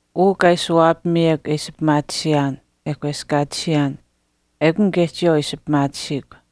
Uu kaa ishi waapamiyekw e ishi pimaatisiyaan e kweskaatisiyaan, ekun kaye chiyawaau ishi pimaatisiikw.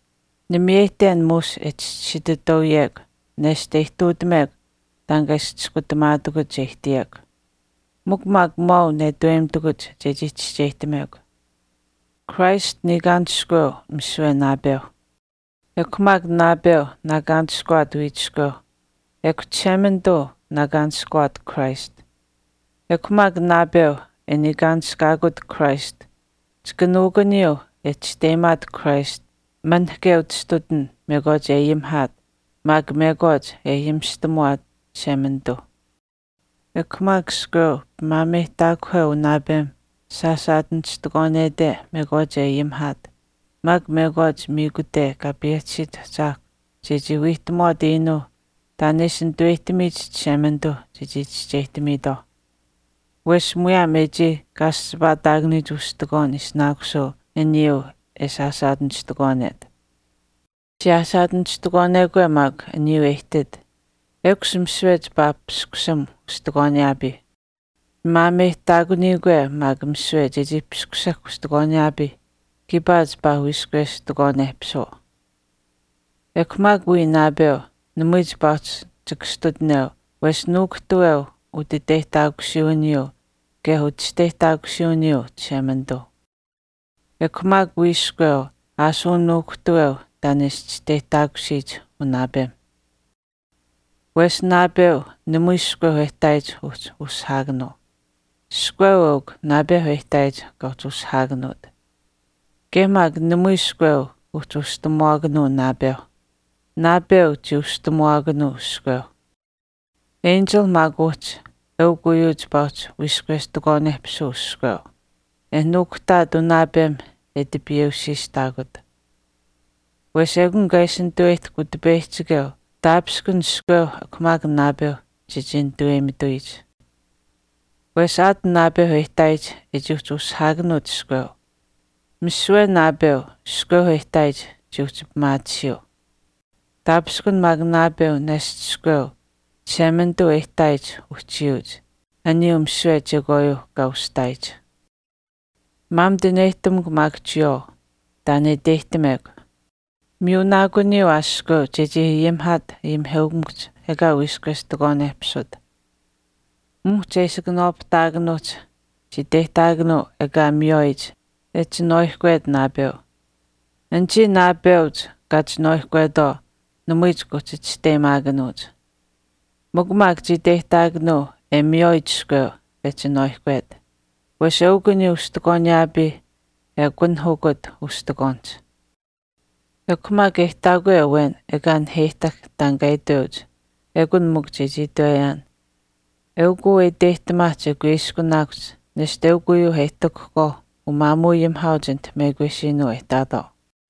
Nimiyeyihten muush e chischisiitutauyekw nesht e ihtuutamekw taan kaa ishi chiskutamaatakuch che ihtiyekw. Mikw maak maau netaweyimitakuch chechii chischeyihtamekw. Christ niikaanishkuweu misiwe naapeuh. Naapeu maak wiichiskweu niikaanishkuweu, ekw Chishemanituu Christ niikaanishkuweu. Ekw maak naapeu e niikaanishkaakut Christ chika nuukuniyuu e chisteyimaat Christ manahke utastutin mekwaach e ayimihaat maak mekwaach ayimishtamuwaate Chishemanituuh. Ekw maak iskweu pimaameyihtaakuheu unaapem sasaachistikwaanete mekwaach e ayimihaat maak mekwaach miikute kaa payehtisiyich ahchaahkwa chechii wiihtamuwaat iinuuh taan e ishi nitaweyihtamiyich Chishemanituu chechii chischeyihtamiitwaau. Wesh muyaam e chii kaaschipaataakanuyich ustikwaan ishinaakusuu aniyuu e saasaachistikwaanet. Siyaasaachistikwaanekwe maak aniyuu e ihtit, ekush misiwe chipaa paskusam ustikwaaniyaapiih. Pimaameyihtaakuniyikwe maak misiwe chechii paskusahk ustikwaaniyaapiih, kiipaa chipaa wiistikwaanehpisuu. Ekw maak wii naapeu namui chipaa uhchi chikastutineu wesh nuukuhtaaweu Chishemanituuh utiteyihtaakusiiwiniyuu kaye uchisteyihtaakusuwiniyuu. Ekw maak wii iskweu ashuu nuukuhtaaweu taan e ishi chisteyihtaakusiyich unaapemh. Wesh naapeu namui iskweu e ihtaayich uhchi ushihaakanuu. Iskweu eukw naapeu e ihtaayich kaa uhchi ushihaakanuut. Kaye maak namui iskweu uhchi ushihtamuwaakanuu naapeuh. Naapeu chii ushihtamuwaakanuu iskweuh. Enchilh maak uhchi eukw uyuu chipaa uhchi wiistikwaanehpisuu iskweu, e nuukuhtaat unaapemh e tipiiweusiitutaakut. Wesh ekun kaa ishi nitaweyihtahk Utipeyihchikeu taapishkun iskweuh ekw maak naapeuh chechii nituweyimituyich. Wesh aat naapeuh e ihtaayich e chii uhchi ushihaakanuut iskweu, misiwe naapeu iskweu e ihtaayich chii uhchi pimaatisiyuu. Taapishkun maak naapeu nesht iskweu Chishemanituu e ihtaayich uhchiyuuch, aniyuuh misiwe chekwaayuu kaa ushihtaayich. Maamituneyihtamukw maak chiyawaau taan e iteyihtamekw. Miyunaakuniyuu aa iskweu chechii ayimihaat ayimiheukamikuhch ekaa wiistikwaanehpisut. Muhch e ishi kanawaapahtaakanuuhch chii iteyihtaakanuu ekaa miywaayich e chinwaaihkwet naapeu. Anichii naapeuch kaa chinwaaihkwetwaau namui chika uhchi chisteyimaakanuuch. Mikw maak chii iteyihtaakanuu e miywaayich iskweu e chinwaaihkwet. Wesh eukw aniyuu ustikwaaniyaapiih e akunahukut ustikwaanihch. Ekw maak e ihtaakwe awen ekaa naheyihtahk taan kaa iteuch, ekun mikw chechii itweyaan, eukuu e iteyihtamaahch e kuiskunaakuhch nesht eukw uyuu e ihtuutahkwaau umaamuuayimihaauch anite mekwesiinuu e ihtaatwaau.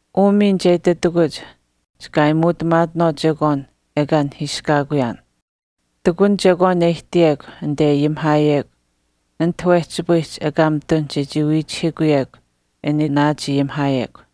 Uu miin che ititakuch chika aayimuutamaatinaawaau chekwaan ekaa nahiiskaakuyaan. Ihtakun chekwaan e ihtiyekw anite e ayimihaayekw ati wehchipayihch ekaa mitun chechii wiichihiikuyekw an e naachayimihaayekw.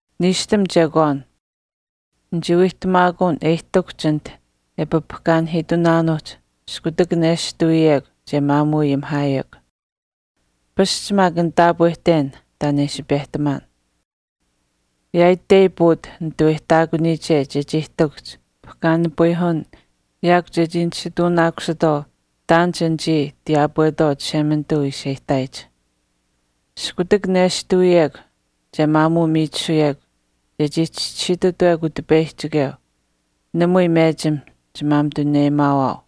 Niishtam chekwaan. Nichii wiihtamaakuun e ihtakuhch anite e papahkaanipayihiitunaanuuhch iskutak nestuwiyekw che maamuuayimihaayekw. Pasch maak nitaapwehten taan e ishi pehtamaan. Yaaitei puut nituweyihtaakuniyiche chechii ihtakuhch pahkaanipayihuwin yaakw chechii nisituunaakusitwaau taan anichii tiyaapwetwaau Chishemanituu ishi e ihtaayich. Iskutak nestuwiyekw che maamuumiichisuyekw chechii chischisiitutawekw Utipeyihchikeu namui mechim chimaamituneyimaawaau.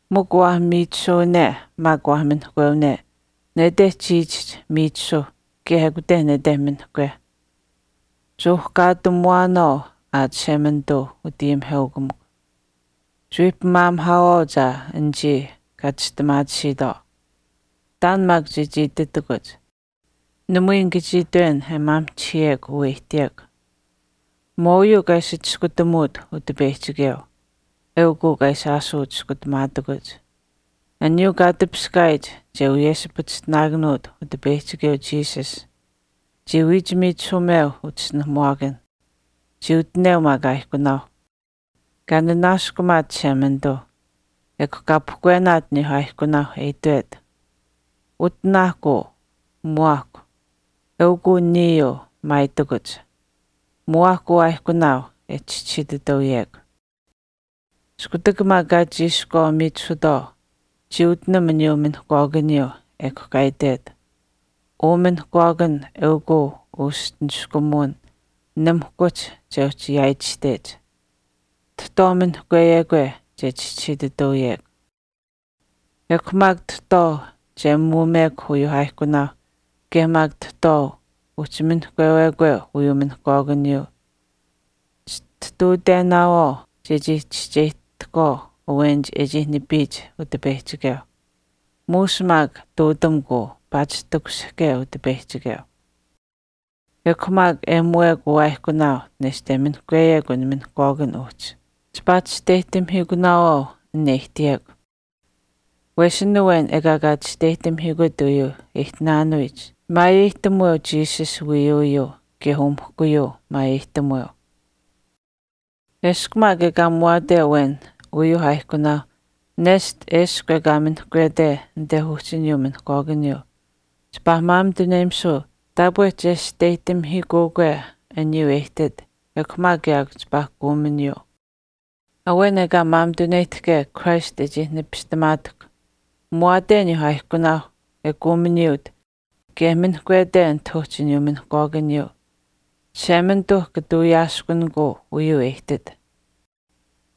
Mikw waah miichisuwane maak mikw waah minihkwewane, nete chiichihch miichisuh kaye ekute nete minihkweh. Chuuhkaatamuwaanaawaau aa Chishemanituu utayimiheukamikw. Chiwii pimaamihaawaauch aa anichii kaa chistimaatisiitwaau. Taan maak chechii ititakuch. Namui nika chii itwen e maamihchihiyekw uu e ihtiyekw. Maauyuu kaa ishi chiskutamuut Utipeyihchikeu, eukw uu kaa ishi aashuu chiskutamaatakuch. Aniyuu kaa tipiskaayich che wiyeshipachishtinaakanuut Utipeyihchikeu Jesus, chii wiichimiichisuumeu uchischinuhamuwaakanh. Chii utineu maak aaihkunaau. Kaa nanaaskumaat Chishemanituuh. Ekw kaa pahkwenaat aniyuu aaihkunaauh, e itwet, “Utinaahkw uu, muwaahkw, eukuu niyuu maayitakuch. Muwaahkw uu aaihkunaau e chischisiitutauyekw.” Iskutak maak kaa chiishkwaa miichisutwaau, chii utinam aniyuu minihkwaakaniyuu, ekw kaa itwet, “Uu minihkwaakan eukw uu uschi niskumuwin nimihkuhch che uhchi yaaitashtech. Tahtwaau minihkweyekwe che chischisiitutauyekw.” Ekw maak tahtwaau che muumekw uyuuh aaihkunaau kaye maak tahtwaau uhchi minihkweyekwe uyuu minihkwaakaniyuu chitihtuutenaawaau chechii chischeyihtahkwaau awenich e chii nipiyich Utipeyihchikeu. Muush maak ihtuutamukw uu paatish takushihke Utipeyihchikeu. Ekw maak e muuwekw uu aaihkunaau nesht e minihkweyekw an minihkwaakan uhchi, chipaa chisteyihtamihiikunaawaau an e ihtiyekw. Wesh an awen ekaa kaa chisteyihtamihiikut uyuu e ihtinaanuyich maayeyihtamuweu Jesus wiiyuuyuu kaye umihkuyuu maayeyihtamuweu. Eshkw maak ekaa muwaate awen uyuu aaihkunaau nesht eshkw ekaa minihkwete anit uhchi aniyuu minihkwaakaniyuu, chipaa maamituneyimisuu taapwe chesteyihtamihiikuukwe aniyuu e ihtit ekw maak yaakw chipaa kuuminiyuu. Awen ekaa maamituneyihtahke aniyuu Christ e chii nipistamaatahkw, muwaate aniyuu aaihkunaauh e kuuminiyuut kaye minihkwete anit uhchi aniyuu minihkwaakaniyuu, Chishemanituu kata wiyaaskunikuu uyuu e ihtit.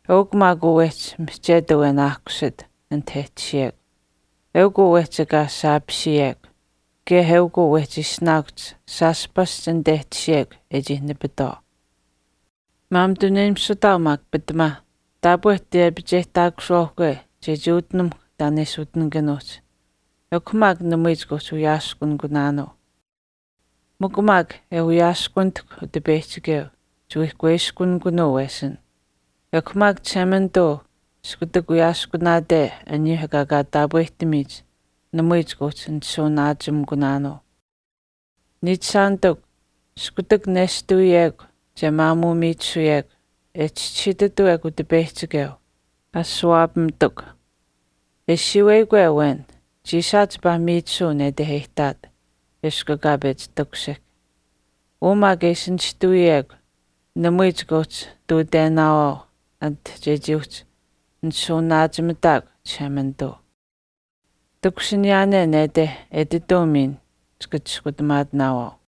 Eukw maak uu wehchi mihchet awen aahkusit anit e tashiyekw. Eukw uu wehchi ekaa saapisiyekw. Kaye eukw uu wehchi ishinaakuhch shaash pasch anit e tashiyekw e chii nipitwaau. Maamituneyimisutaau maak taapwe tiyepicheyihtaakusuwaauhkwe chechii utinamuhkw taan e ishi utinikanuuhch namui chika uhchi wiyaaskunikunaanuu. Mikw maak e wiyaaskunitahkw Utipeyihchikeu, chiwii kuiskunikunuu wesin, ekw maak Chishemanituu iskutak wiyaaskunaate aniyuu ekaa kaa taapwehtamiyich namui chika uhchi nishuuwanaachimikunaanuu. Niichishaanitikw, iskutak nishtawiyekwe che maamuu miichisuyekw e chischisiitutawekw Utipeyihchikeu, ashuwaapamaahkuch kutakach. E siiweyikwe awen, chiisaach chipaa miichisuu nete e ihtaat eshkw ekaa pechi takushihk. Uu maak e ishi nishtawiyekw namui chika uhchi ihtuutenaawaau chekwaan anit chechii uhchi nishuuwanaachimitaakw Chishemanituu. Takushiniyaane nete etituu miin chika chiskutamaatinaawaau.